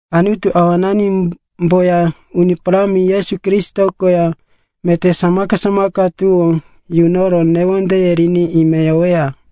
Anutu Awananimboya Uni Parámi Yesu Kristo koya, meté samaka-samaka tuwó yunoro newondeye riri ime yoweya.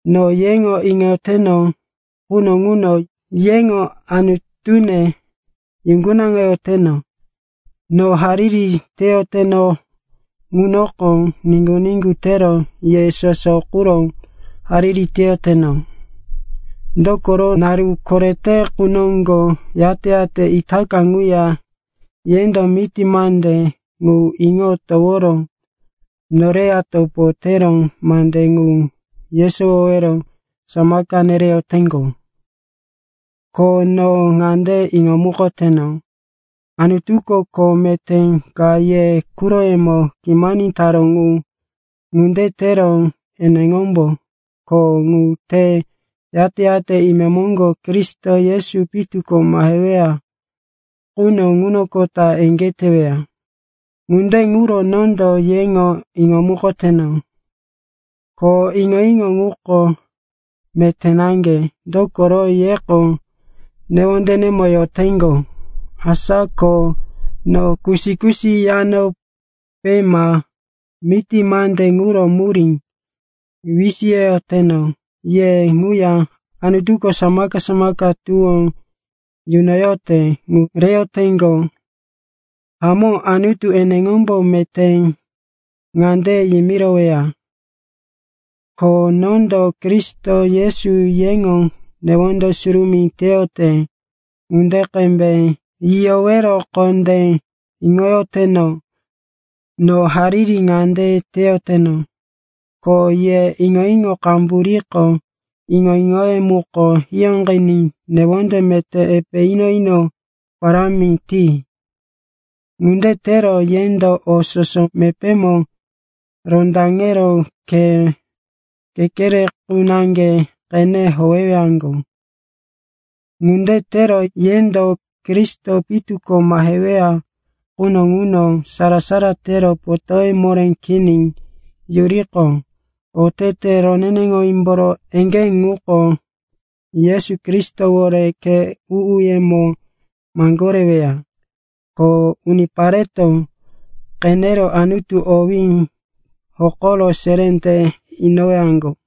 No yeŋo iŋoyoteno quno ŋuno yeŋo Anutune yuŋgunaŋoyoteno. No hariri teyoteno ŋunoko niŋgu-niŋgu tero ye soso quro hariri teyoteno. Dokoro, naru korete qu noŋgo yate-yate itaka ŋuya yendo miti mande ŋu iŋo toworo noreya topo tero mande ŋu yesowowero samaka nereyoteŋgo. Ko no ŋande iŋomukoteno, Anutuko kho meté ka ye quroyemo kimani taró ŋu. Ŋunde tero eneŋombo kho ŋu te yate-yate imemoŋgo Kristo Yesu pitu ko maheweya quno ŋunoqota eŋgé teweya. Ŋunde ŋuro nondo yeŋo iŋomukoteno, ko iŋo-iŋo ŋuko meté naŋge. Dokoro yeko newondenemo yoteŋgo. Asa ko no kusi-kusi yanope ma miti mande ŋuro murí wisiyoyoteno ye ŋuya Anutuko samaka-samaka tuwó nunoyote ŋu reyoteŋgo. Hamó, Anutu eneŋombo meté ŋande yimiroweya, ko nondo Kristo Yesu yeŋo newonde surumí teyote ŋunde qembe yiyowero kondé iŋoyoteno. No hariri ŋande teyoteno, ko ye iŋo-iŋo qambu riqo iŋo-iŋoye muko hiyóqiní newonde meté epe ino-ino parámi ti. Ŋunde tero yendo o soso mepémo rondaŋero khe kekere qu naŋge qene howewaŋgo. Ŋunde tero yendo Kristo pitu ko maheweya quno ŋuno sara-sara tero potóye moré kini yuriqo, otete roneneŋowímboro eŋgé ŋuko Yesu Kristowore khe u-uyemo maŋgoreweya. Ko unipareto qenero Anutu owí hokoro seré te inowaŋgo.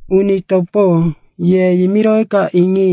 Uni topo, ye yimiroweka iŋi,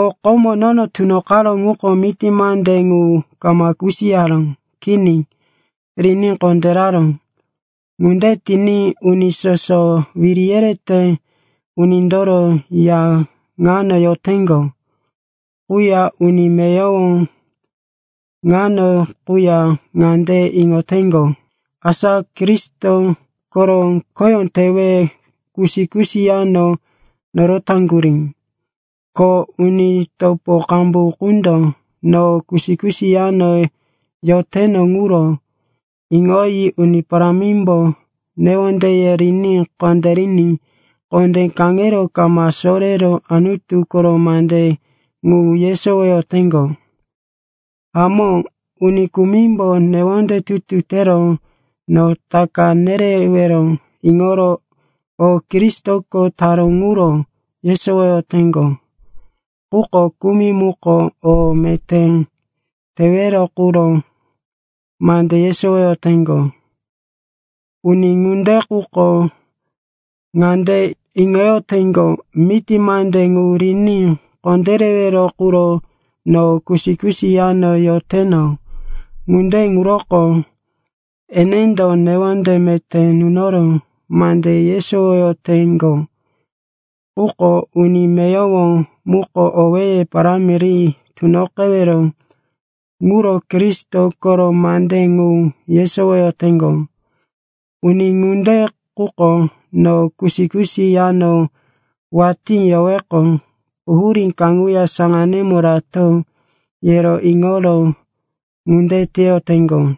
o komo nono tunoqaró ŋuko miti mande ŋu kama kusiyaró. Kini, riní kondéraró. Ŋunde tiní uni soso wiri yerete unindoro ya ŋano yoteŋgo quya uni meyowo ŋano quya ŋande iŋoteŋgo, asa Kristo koro khoyó tewe kusi-kusi yano norotaŋgurí. Ko uni topo qambu qundo no kusi-kusi yano yoteno ŋuro iŋoyi Uni Parámimbo newondeye riní kondériní kondé kaŋero kama sorero Anutu koro mande ŋu yesowoyoteŋgo. Hamó, uni kumimbo newonde tutu tero no taka nerewero iŋoro o Kristoko taró ŋuro yesowoyoteŋgo. Quko kumi muko o meté tewero quro mande yesowoyoteŋgo. Uni ŋunde quko ŋande iŋoyoteŋgo, miti mande ŋu riní kondérewero quro no kusi-kusi yano yoteno. Ŋunde ŋuroko enendo newonde meté nunoro mande yesowoyoteŋgo. Quko uni meyowo muko owéye parámi ri tunoqewero ŋuro Kristo koro mande ŋu yesowoyoteŋgo. Uni ŋunde quko no kusi-kusi yano watí yoweqo, quhurí kaŋuya saŋanímo rato, yero iŋoro ŋunde teyoteŋgo.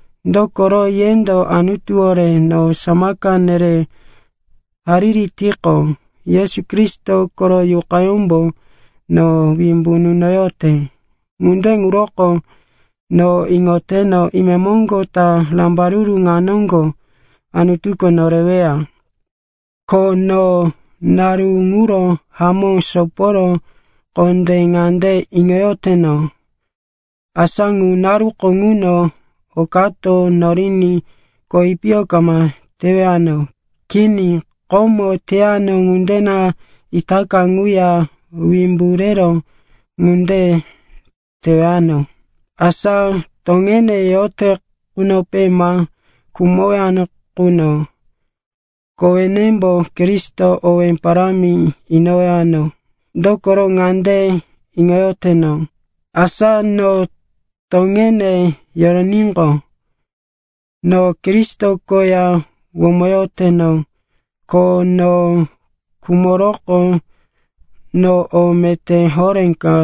dokoro, yendo Anutuwore no samaka nere hariri tiqo, Yesu Kristo koro Yuqayómbo no wimbu nunoyote. Ŋunde ŋuroko, no iŋoteno, imemoŋgo ta rambaruru ŋa noŋgo Anutuko noreweya. Ko no naru ŋuro hamó soporo kondé ŋande iŋoyoteno, asa ŋu naruko ŋuno okato noriní kowi piyo kama tewano. Kini, komo teyano ŋunde na itaka ŋuya wimbu rero ŋunde tewano, asa toŋene yote qunope ma khumowano quno, kowenembo Kristo owé parámi inowano. Dokoro ŋande iŋoyoteno, asa no toŋene yoroníqo, no Kristo koya womoyoteno. Ko no khumoroqo, no o meté horé ka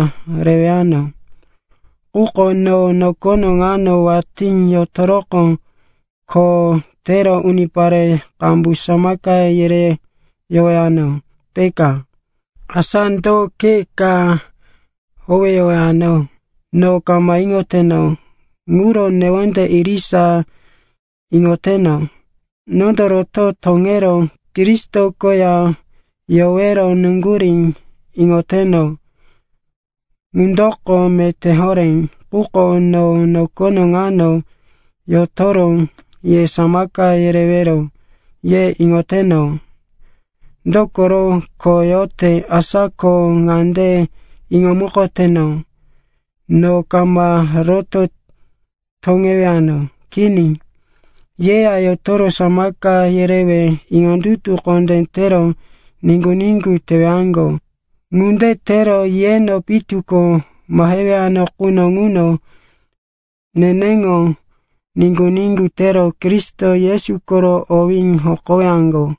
rewano. Quko no nokono ŋano watí yotoroqo kho tero unipare qambu samaka yereyowano, peka. Asa do khe ka howeyowano? No kama iŋoteno. Ŋuro newonde irisa iŋoteno. Nondo roto toŋero Kristo koya yowero nuŋgurí iŋoteno. Ŋundoko meté horé. Quko, no nokono ŋano yotoro ye samaka yerewero, ye iŋoteno. Dokoro kho yote. Asa ko ŋande iŋomukoteno, no kama roto toŋewano. Kini, yeya yotoro samaka yerewe iŋondutu kondé tero niŋgu-niŋgu tewaŋgo. Ŋunde tero yeno pitu ko mahewano quno ŋuno neneŋo niŋgu-niŋgu tero Kristo Yesu koro owí hokowaŋgo.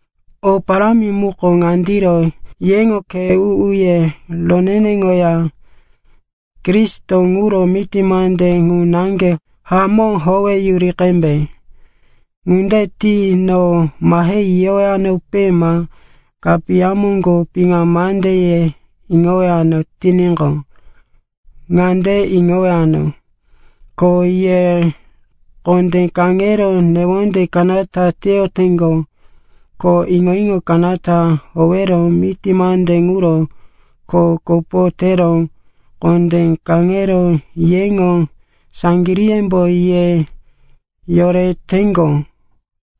O parámi muko ŋandiro, yeŋo khe u-uye roneneŋoya Kristo ŋuro miti mande ŋu naŋge hamó howeyuri qembe. Ŋunde ti no mahe yiyowanope ma kapiya moŋgo piŋa mandeye iŋowano tiníqo, ŋande iŋowano, ko ye kondé kaŋero newonde kanata teyoteŋgo. Ko iŋo-iŋo kanata howero miti mande ŋuro kho kopo tero kondé kaŋero yeŋo saŋgiríyembo ye yoreteŋgo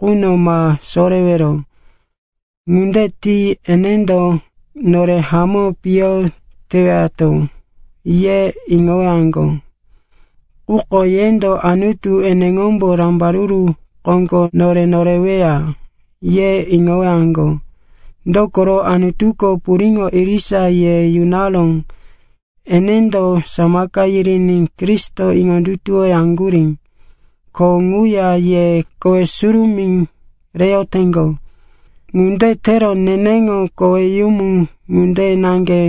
quno ma sorewero. Ŋunde ti, enendo, nore hamó piyo tewato, ye iŋowaŋgo, quko yendo, Anutu eneŋombo rambaruru koŋgo nore noreweya, ye iŋowaŋgo. Dokoro, Anutuko puriŋo irisa ye yunaró. Enendo samaka yiriní Kristo iŋondutuwoyaŋgurí, ko ŋuya ye kowe surumí reyoteŋgo. Ŋunde tero neneŋo koweyumu ŋunde naŋge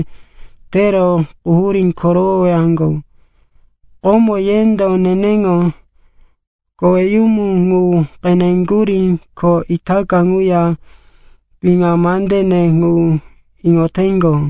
tero quhurí korowowaŋgo. Komo yendo neneŋo koweyumu ŋu qeneŋgurí, ko itaka ŋuya piŋa mandene ŋu iŋoteŋgo.